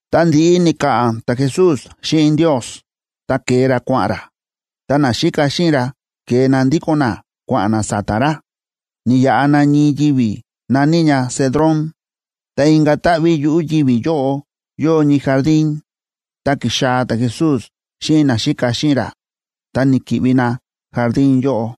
Tá ndi̱ꞌi ni̱ka̱ꞌa̱n ta̱Jesús xíꞌin Ndios, ta ke̱e ra kua̱ꞌa̱n ra, ta naxíka xíꞌin ra ke̱e na ndíko̱n na kua̱ꞌa̱n na sa̱ta̱ ra. Ni̱yaꞌa na ñii yivi̱ na̱ní ña Cedrón. Ta inka̱ táꞌví yuꞌu̱ yivi̱ yóꞌo yóo ñii jardín, ta ki̱xaa̱ ta̱Jesús xíꞌin naxíka xíꞌin ra, ta ni̱ki̱ꞌvi na jardín yóꞌo.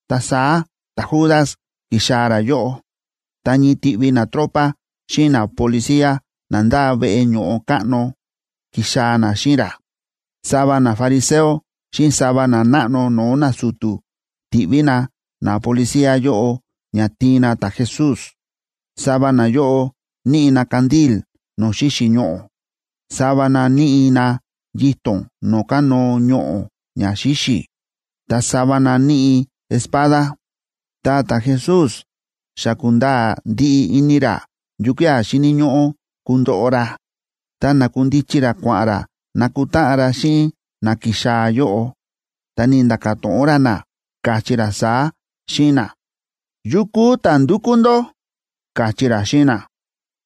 Ta saá ta̱Judas ki̱xaa̱ ra yóꞌo, ta ñii tiꞌvi natropa xíꞌin napolicía na ndáa veꞌe ño̱ꞌo káꞌno ki̱xaa̱ na xíꞌin ra. Sava nafariseo xíꞌin sava nanáꞌno no̱o̱ nasu̱tu̱ ti̱ꞌví na napolicía yóꞌo ña tiin na ta̱Jesús. Sava nayóꞌo níꞌi na candil no̱o̱ xíxi̱ ñoꞌo̱, sava na níꞌi na yito̱n no̱o̱ kánóo ñoꞌo̱ ña xíxi̱, ta sava na níꞌi espada. Ta ta̱Jesús xa kúnda̱a̱ ndiꞌi ini ra yukía̱ xíni̱ ñóꞌó kundoꞌo ra, ta na̱kundichi ra kua̱ꞌa̱n ra nakutáꞌan ra xíꞌin na ki̱xaa̱ yóꞌo, ta ni̱nda̱ka̱ to̱ꞌon ra na, káchí ra saá xíꞌin na: ―¿Yukú ta̱ ndúkú ndó? ―káchí ra xíꞌin na.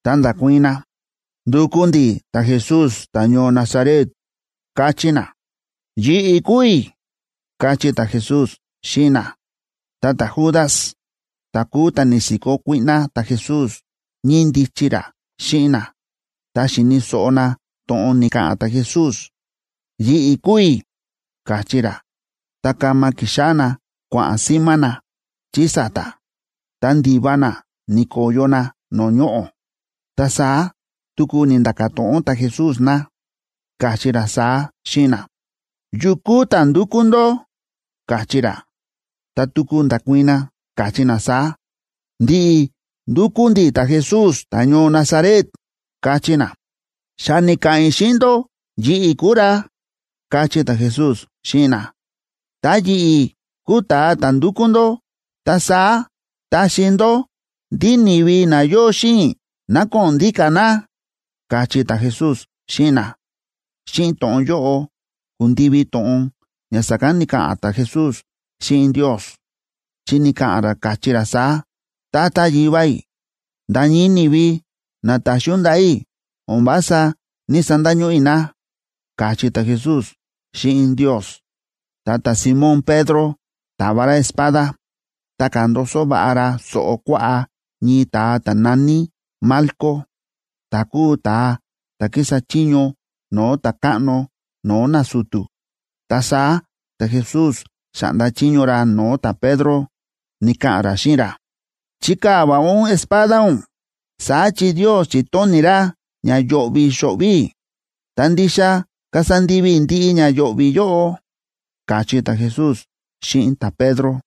Ta nda̱kuii̱n na: ―Ndúkú ndi̱ ta̱Jesús, ta̱ñoo Nazaret ―káchí na. ―Yi̱ꞌi̱ Kúu i̱ ―káchí ta̱Jesús xíꞌin na.a Ta ta̱Judas, ta̱ kúu ta̱ ni̱si̱kó kuíꞌná ta̱Jesús, ñíndichi ra xíꞌin na. Tá xíni̱ so̱ꞌo na to̱ꞌon ni̱ka̱ꞌa̱n ta̱Jesús: “Yi̱ꞌi̱ kúu i̱”, káchí ra, ta kama ki̱xáꞌá na kua̱ꞌa̱n símá na chí sa̱ta̱, ta ndi̱va na ni̱ko̱yo na no̱o̱ ñoꞌo̱. Ta saá tuku ni̱nda̱ka̱ to̱ꞌon ta̱Jesús na, káchí ra saá xíꞌin na: ―¿Yukú ta̱ ndúkú ndó? ―káchí ra. Ta tuku nda̱kuii̱n na, káchí na saá: ―Ndi̱ꞌi̱ ndúkú ndi̱ ta̱Jesús, ta̱ñoo Nazaret ―káchí na. ―Xa ni̱ka̱ꞌa̱n i̱ xíꞌin ndó yi̱ꞌi̱ kúu ra ―káchí ta̱Jesús xíꞌin na. ―Tá yi̱ꞌi̱ kúu ta̱a ta̱ ndúkú ndó, ta saá taxi ndó ndí ni̱vi na yóo xíꞌin i̱ ná ko̱ꞌo̱n ndíka̱ na ―káchí ta̱Jesús xíꞌin na. Xíꞌin to̱ꞌon yóꞌo ku̱ndivi to̱ꞌon ña sa̱kán ni̱ka̱ꞌa̱n ta̱Jesús xíꞌin Ndios, chi ni̱ka̱ꞌa̱n ra, káchí ra saá: “Tata Yivá i̱, nda̱ ñii ni̱vi na ta̱xi ún ndaꞌa̱ i̱, o̱n vása ní‑sandañóꞌó i̱ na”, káchí ta̱Jesús xíꞌin Ndios. Ta ta̱Simón Pedro ta̱va ra espada, ta ka̱ndoso va̱ꞌa ra so̱ꞌo kuaꞌá ñii ta̱a ta̱ na̱ní Malco, ta̱ kúu ta̱a ta̱ kísa chiño no̱o̱ ta̱káꞌno no̱o̱ nasu̱tu̱. Ta saá ta̱Jesús xa̱ꞌnda chiño ra no̱o̱ ta̱Pedro, ni̱ka̱ꞌa̱n ra xíꞌin ra: ―Chikaa̱ va̱ꞌa ún espada ún, saá chi Ndios chi̱tóni̱ ra ña yo̱ꞌvi̱ xo̱ꞌvi̱ i̱, ta ndixa kasa ndivi i̱ ndiꞌi ña yo̱ꞌvi̱ yóꞌo ―káchí ta̱Jesús xíꞌin ta̱Pedro.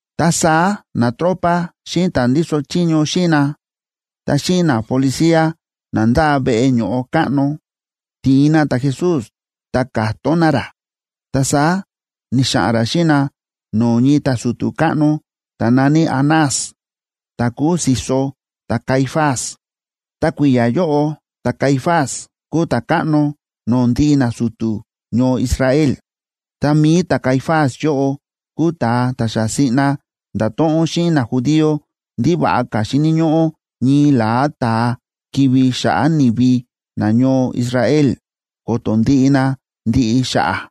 Ta saá natropa xíꞌin ta̱ ndíso chiño xíꞌin na, ta xíꞌin napolicía na ndáa veꞌe ño̱ꞌo káꞌno, ti̱in na ta̱Jesús, ta ka̱tón na ra. Ta saá ni̱xa̱ꞌa̱n ra xíꞌin na no̱o̱ ñii ta̱su̱tu̱ káꞌno ta̱ na̱ní Anás, ta̱ kúu si̱so ta̱Caifás. Ta kui̱ya̱ yóꞌo ta̱Caifás kúu ta̱káꞌno no̱o̱ ndiꞌi nasu̱tu̱ ñoo Israel. Ta mi̱i ta̱Caifás yóꞌo kúu ta̱a ta̱ xa siꞌna nda̱to̱ꞌon xíꞌin najudío ndí va̱ꞌa ka̱ xíni̱ ñóꞌó ñii la̱á ta̱a kivi̱ xa̱ꞌa̱ ni̱vi nañoo Israel, ko̱to̱ ndiꞌi na ndiꞌi xa̱ꞌa̱.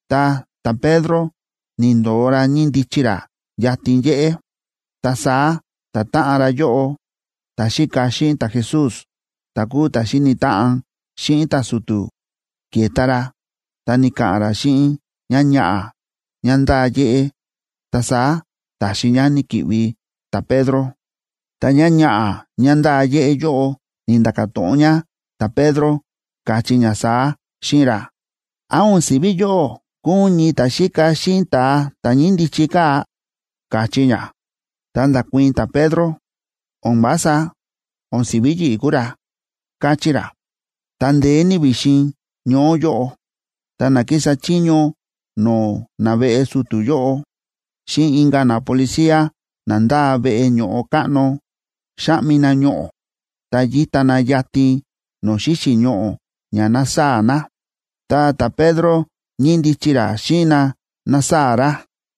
Ta ta̱Pedro ni̱ndo̱o ra ñíndichi ra yatin yéꞌé. Ta saá ta̱táꞌan ra yóꞌo, ta̱xíka xíꞌin ta̱Jesús, ta̱ kúu ta̱ xíni̱ táꞌan xíꞌin ta̱su̱tu̱, ke̱ta ra ta ni̱ka̱ꞌa̱n ra xíꞌin ñáñaꞌa̱ ñá ndáa yéꞌé. Ta saá ta̱xi ñá ni̱ki̱ꞌvi ta̱Pedro. Ta ñáñaꞌa̱ ñá ndáa yéꞌé yóꞌo ni̱nda̱ka̱ to̱ꞌon ñá ta̱Pedro, káchí ñá saá xíꞌin ra: ―¿Án o̱n si̱ví yóꞌó kúu ún ñii ta̱xíka xíꞌin ta̱a ta̱ ñíndichi kaa̱? ―káchí ñá. Ta nda̱kuii̱n ta̱Pedro: ―¡O̱n vása! O̱n si̱ví yi̱ꞌi̱ kúu ra ―káchí ra. Ta ndeé ní vi̱xin ñoó yóꞌo, ta na kísa chiño no̱o̱ naveꞌe su̱tu̱ yóꞌo xíꞌin inka̱ napolicía na ndáa veꞌe ño̱ꞌo káꞌno, xáꞌmi na ñoꞌo̱, ta yíta na yatin no̱o̱ xíxi̱ ñoꞌo̱ ña nasaa̱ na. Ta ta̱Pedro ñíndichi ra xíꞌin na násaa̱ ra.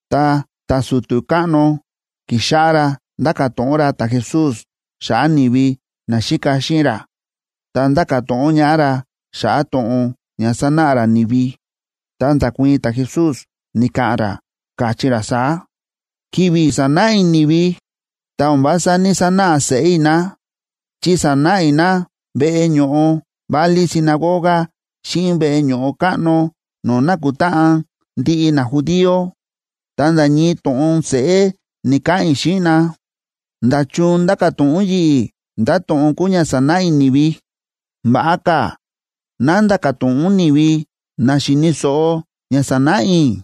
Ta ta̱su̱tu̱ káꞌno ki̱xáꞌá ra ndáka̱ to̱ꞌon ra ta̱Jesús xa̱ꞌa̱ ni̱vi naxíka xíꞌin ra, ta ndáka̱ to̱ꞌon ñaꞌá ra xa̱ꞌa̱ to̱ꞌon ña sa̱náꞌa ra ni̱vi. Ta nda̱kuii̱n ta̱Jesús, ni̱ka̱ꞌa̱n ra, káchí ra saá: ―Ki̱vi̱ sa̱náꞌa i̱ ni̱vi, ta o̱n vása ní‑sanáꞌa seꞌé i̱ na, chi sa̱náꞌa i̱ na veꞌe ño̱ꞌo válí sinagoga xíꞌin veꞌe ño̱ꞌo káꞌno no̱o̱ nákutáꞌan ndiꞌi najudío, ta nda̱ ñii to̱ꞌon seꞌé ni̱‑kaꞌa̱n i̱ xíꞌin na. ¿Nda̱chun ndáka̱ to̱ꞌon ún yi̱ꞌi̱ ndá to̱ꞌon kúu ña sa̱náꞌa i̱ ni̱vi? Va̱ꞌa ka̱ ná nda̱ka̱ to̱ꞌon ún ni̱vi na xi̱ni̱ so̱ꞌo ña sa̱náꞌa i̱,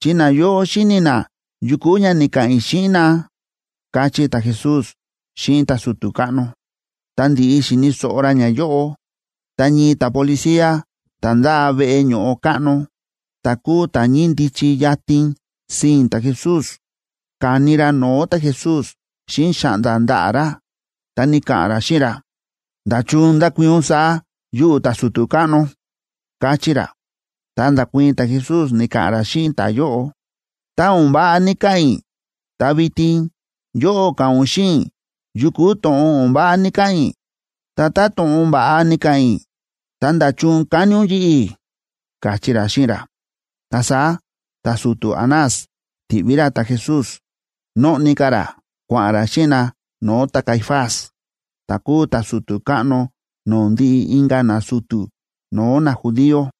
chi nayóꞌo xíni̱ na yu kúu ña ni̱ka̱ꞌa̱n i̱ xíꞌin na ―káchí ta̱Jesús xíꞌin ta̱su̱tu̱ káꞌno. Tá ndi̱ꞌi xi̱ni̱ so̱ꞌo ra ñayóꞌo, ta ñii ta̱policía ta̱ ndáa veꞌe ño̱ꞌo káꞌno, ta̱ kúu ta̱ ñíndichi yatin sii̱n ta̱Jesús, ka̱ni ra no̱o̱ ta̱Jesús xíꞌin xa̱ꞌnda̱ ndaꞌa̱ ra, ta ni̱ka̱ꞌa̱n ra xíꞌin ra: ―¿Nda̱chun ndákuii̱n ún saá yuꞌu̱ ta̱su̱tu̱ káꞌno? ―káchí ra. Ta nda̱kuii̱n ta̱Jesús, ni̱ka̱ꞌa̱n ra xíꞌin ta̱yóꞌo: ―Tá o̱n váꞌa ni̱ka̱ꞌa̱n i̱, ta vitin yóꞌó ka̱ꞌa̱n ún xíꞌin i̱ yu kúu to̱ꞌon o̱n váꞌa ni̱ka̱ꞌa̱n i̱. Ta tá to̱ꞌon va̱ꞌa ni̱ka̱ꞌa̱n i̱, ta, ¿nda̱chun ka̱ni ún yi̱ꞌi̱? ―káchí ra xíꞌin ra. Ta saá ta̱su̱tu̱ Anás ti̱ꞌví ra ta̱Jesús, nóꞌni ka̱ ra, kua̱ꞌa̱n ra xíꞌin na no̱o̱ ta̱Caifás, ta̱ kúu ta̱su̱tu̱ káꞌno no̱o̱ ndiꞌi inka̱ nasu̱tu̱ no̱o̱ najudío.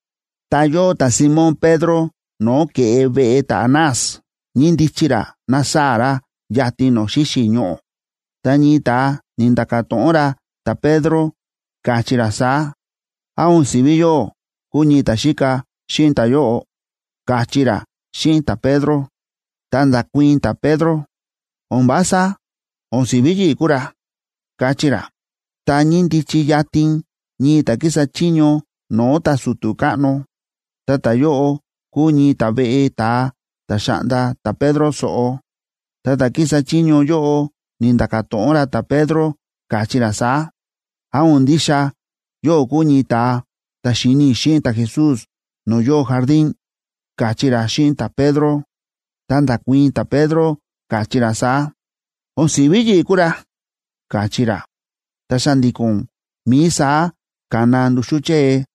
Ta yóo ta̱Simón Pedro no̱o̱ ke̱ꞌe veꞌe ta̱Anás, ñíndichi ra násaa̱ ra yatin no̱o̱ xíxi̱ ñoꞌo̱. Ta ñii ta̱a ni̱nda̱ka̱ to̱ꞌon ra ta̱Pedro, káchí ra saá: ―¿Án o̱n si̱ví yóꞌó kúu ñii ta̱xíka xíꞌin ta̱yóꞌo? ―káchí ra xíꞌin ta̱Pedro. Ta nda̱kuii̱n ta̱Pedro: ―¡O̱n vása! O̱n si̱ví yi̱ꞌi̱ kúu ra ―káchí ra. Ta ñíndichi yatin ñii ta̱ kísa chiño no̱o̱ ta̱su̱tu̱ káꞌno, ta ta̱yóꞌo kúu ñii ta̱veꞌe ta̱a ta̱ xa̱ꞌnda ta̱Pedro so̱ꞌo. Ta ta̱ kísa chiño yóꞌo ni̱nda̱ka̱ to̱ꞌon ra ta̱Pedro, káchí ra saá: ―¿Án o̱n ndixa yóꞌó kúu ñii ta̱a ta̱ xi̱ni i̱ xíꞌin ta̱Jesús no̱o̱ yóo jardín? ―káchí ra xíꞌin ta̱Pedro. Ta nda̱kuii̱n ta̱Pedro, káchí ra saá: ―O̱n si̱ví yi̱ꞌi̱ kúu ra ―káchí ra. Ta xa̱ndi̱ko̱n mií saá ka̱na nduxú chée.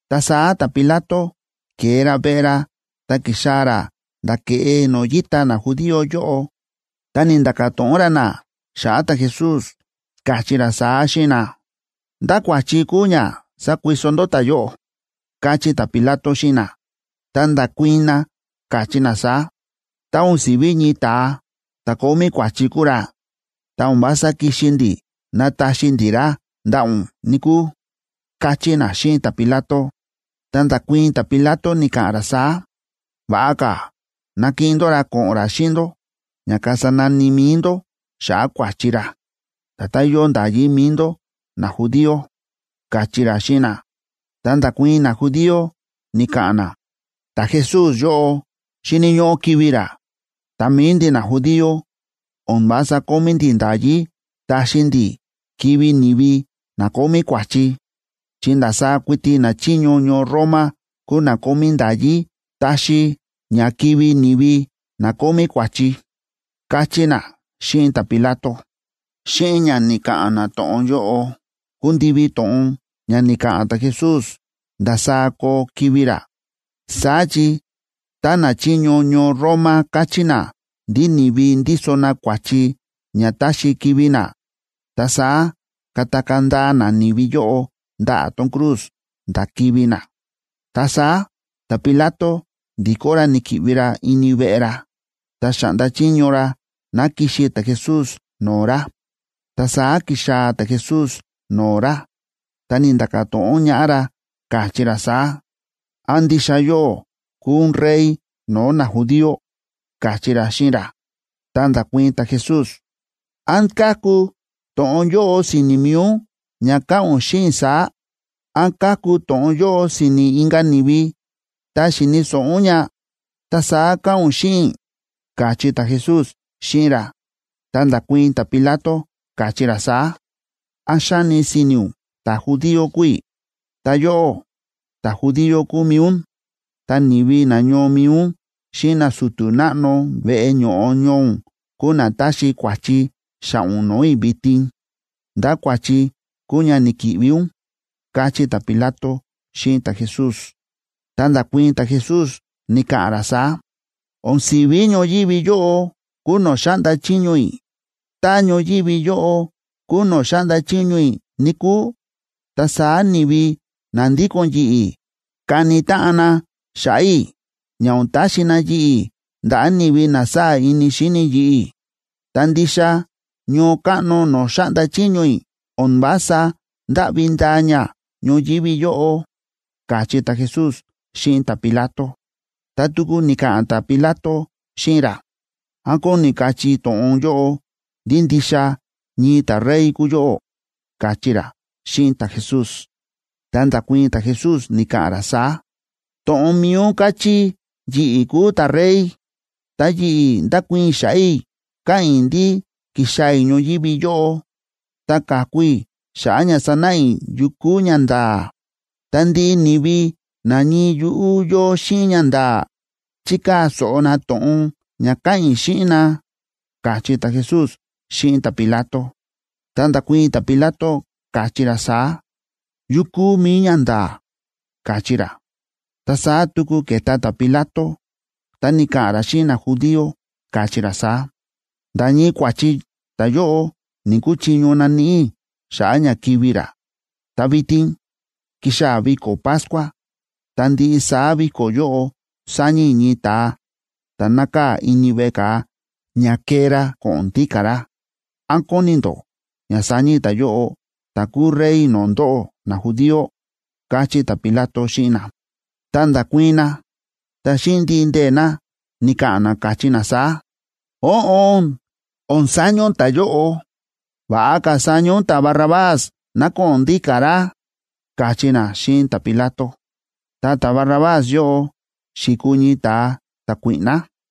Ta saá ta̱Pilato ke̱e ra veꞌe ra ta ki̱xaa̱ ra nda̱ ke̱ꞌe no̱o̱ yíta najudío yóꞌo, ta ni̱nda̱ka̱ to̱ꞌon ra na xa̱ꞌa̱ ta̱Jesús, káchí ra saá xíꞌin na: ―¿Ndá kua̱chi kúu ña sákuiso ndó ta̱yóꞌo? ―káchí ta̱Pilato xíꞌin na. Ta nda̱kuii̱n na, káchí na saá: ―Tá o̱n si̱ví ñii ta̱a ta̱ kómí kua̱chi kúu ra, ta o̱n vása kixi ndi̱ nataxi ndi̱ ra ndaꞌa̱ ún, níkúu ―káchí na xíꞌin ta̱Pilato. Ta nda̱kuii̱n ta̱Pilato, ni̱ka̱ꞌa̱n ra saá: ―Va̱ꞌa ka̱ nakiꞌin ndó ra ko̱ꞌo̱n ra xíꞌin ndó ña kasa nani mi̱i ndó xa̱ꞌa̱ kua̱chi ra, nda̱tán yóo nda̱yí mi̱i ndó najudío ―káchí ra xíꞌin na. Ta nda̱kuii̱n najudío, ni̱ka̱ꞌa̱n na: ―Ta̱Jesús yóꞌo xíni̱ ñóꞌó kivi̱ ra, ta mi̱i ndi̱ najudío, o̱n vása kómí ndi̱ nda̱yí taxi ndi̱ kivi̱ ni̱vi na kómí kua̱chi, chi ndasaá kuiti nachiño ñoo Roma kúu na kómí nda̱yí taxi ña kivi̱ ni̱vi na kómí kua̱chi ―káchí na xíꞌin ta̱Pilato. Xíꞌin ña ni̱ka̱ꞌa̱n na to̱ꞌon yóꞌo, ku̱ndivi to̱ꞌon ña ni̱ka̱ꞌa̱n ta̱Jesús ndasaá koo kivi̱ ra. Saá chi tá nachiño ñoo Roma káchí na ndí ni̱vi ndíso na kua̱chi ña táxi kivi̱ na, ta saá katakaa̱ ndaa na ni̱vi yóꞌo ndaꞌa̱ tón cruz nda̱ kivi̱ na. Ta saá ta̱Pilato ndi̱kó ra ni̱ki̱ꞌvi ra ini veꞌe ra, ta xa̱ꞌnda chiño ra ná kixi ta̱Jesús no̱o̱ ra. Ta saá ki̱xaa̱ ta̱Jesús no̱o̱ ra, ta ni̱nda̱ka̱ to̱ꞌon ñaꞌá ra, káchí ra saá: ―¿Án ndixa yóꞌó kúu ún Rey no̱o̱ najudío? ―káchí ra xíꞌin ra. Ta nda̱kuii̱n ta̱Jesús: ―¿Án káku to̱ꞌon yóꞌo si̱ni̱ mi̱i ún ña káꞌa̱n ún xíꞌin i̱ saá? ¿Án káku to̱ꞌon yóꞌo si̱ni̱ inka̱ ni̱vi, ta xi̱ni̱ so̱ꞌo ún ña, ta saá káꞌa̱n ún xíꞌin i̱? ―káchí ta̱Jesús xíꞌin ra. Ta nda̱kuii̱n ta̱Pilato, káchí ra saá: ―¿Án xáni si̱ni̱ ún ta̱judío kúu i̱? Ta yóꞌó, ta̱judío kúu mi̱i ún, ta ni̱vi nañoo mi̱i ún xíꞌin nasu̱tu̱ náꞌno veꞌe ño̱ꞌo ñoo ún kúu na táxi kua̱chi xa̱ꞌa̱ ún no̱o̱ i̱ vitin. ¿Ndá kua̱chi kúu ña ni̱ki̱ꞌvi ún? ―káchí ta̱Pilato xíꞌin ta̱Jesús. Ta nda̱kuii̱n ta̱Jesús, ni̱ka̱ꞌa̱n ra saá: ―O̱n si̱ví ñoyívi yóꞌo kúu no̱o̱ xáꞌnda chiño i̱. Tá ñoyívi yóꞌo kúu no̱o̱ xáꞌnda chiño i̱, níkúu, ta saá ni̱vi na ndíko̱n yi̱ꞌi̱ kani táꞌan na xa̱ꞌa̱ i̱, ña o̱n taxi na yi̱ꞌi̱ ndaꞌa̱ ni̱vi na sáa̱ ini xíni yi̱ꞌi̱. Ta ndixa ñoo káꞌno no̱o̱ xáꞌnda chiño i̱ o̱n vása ndáꞌvi ndaa ña ñoyívi yóꞌo ―káchí ta̱Jesús xíꞌin ta̱Pilato. Ta tuku ni̱ka̱ꞌa̱n ta̱Pilato xíꞌin ra: ―¿Án kóni kachí to̱ꞌon yóꞌo ndí ndixa ñii ta̱rey kúu yóꞌó? ―káchí ra xíꞌin ta̱Jesús. Ta nda̱kuii̱n ta̱Jesús, ni̱ka̱ꞌa̱n ra saá: ―To̱ꞌon mi̱i ún káchí yi̱ꞌi̱ kúu ta̱rey. Ta yi̱ꞌi̱ ndákuii̱n i̱ xa̱ꞌa̱ i̱, káꞌa̱n i̱ ndí ki̱xaa̱ i̱ ñoyívi yóꞌo ta ka̱ku i̱ xa̱ꞌa̱ ña sanáꞌa i̱ yu kúu ñanda̱a̱. Ta ndiꞌi ni̱vi na ñii yuꞌú yóo xíꞌin ñanda̱a̱ chíkaa̱ so̱ꞌo na to̱ꞌon ña káꞌa̱n i̱ xíꞌin na ―káchí ta̱Jesús xíꞌin ta̱Pilato. Ta nda̱kuii̱n ta̱Pilato, káchí ra saá: ―¿Yu kúu mi̱i ñanda̱a̱? ―káchí ra. Ta saá tuku ke̱ta ta̱Pilato, ta ni̱ka̱ꞌa̱n ra xíꞌin najudío, káchí ra saá: ―Nda̱ ñii kua̱chi ta̱yóꞌo ni̱‑kuchiño naníꞌi i̱ xa̱ꞌa̱ ña kivi̱ ra. Ta vitin kixaa̱ viko̱ Pascua, ta ndiꞌi saá viko̱ yóꞌo saña i̱ ñii ta̱a ta̱ nákaa̱ ini veꞌe ka̱a ña kee ra ko̱ꞌo̱n ndíka̱ ra. ¿Án kóni ndó ña saña i̱ ta̱yóꞌo, ta̱ kúu Rey no̱o̱ ndóꞌó najudío? ―káchí ta̱Pilato xíꞌin na. Ta nda̱kuii̱n na, ta xíꞌin ndiꞌi ndee̱ na, ni̱ka̱ꞌa̱n na, káchí na saá: ―Óꞌon, o̱n saña ún ta̱yóꞌo. Va̱ꞌa ka̱ saña ún ta̱Barrabás ná ko̱ꞌo̱n ndíka̱ ra ―káchí na xíꞌin ta̱Pilato. Ta ta̱Barrabás yóꞌo xi̱kuu ñii ta̱a ta̱kuíꞌná.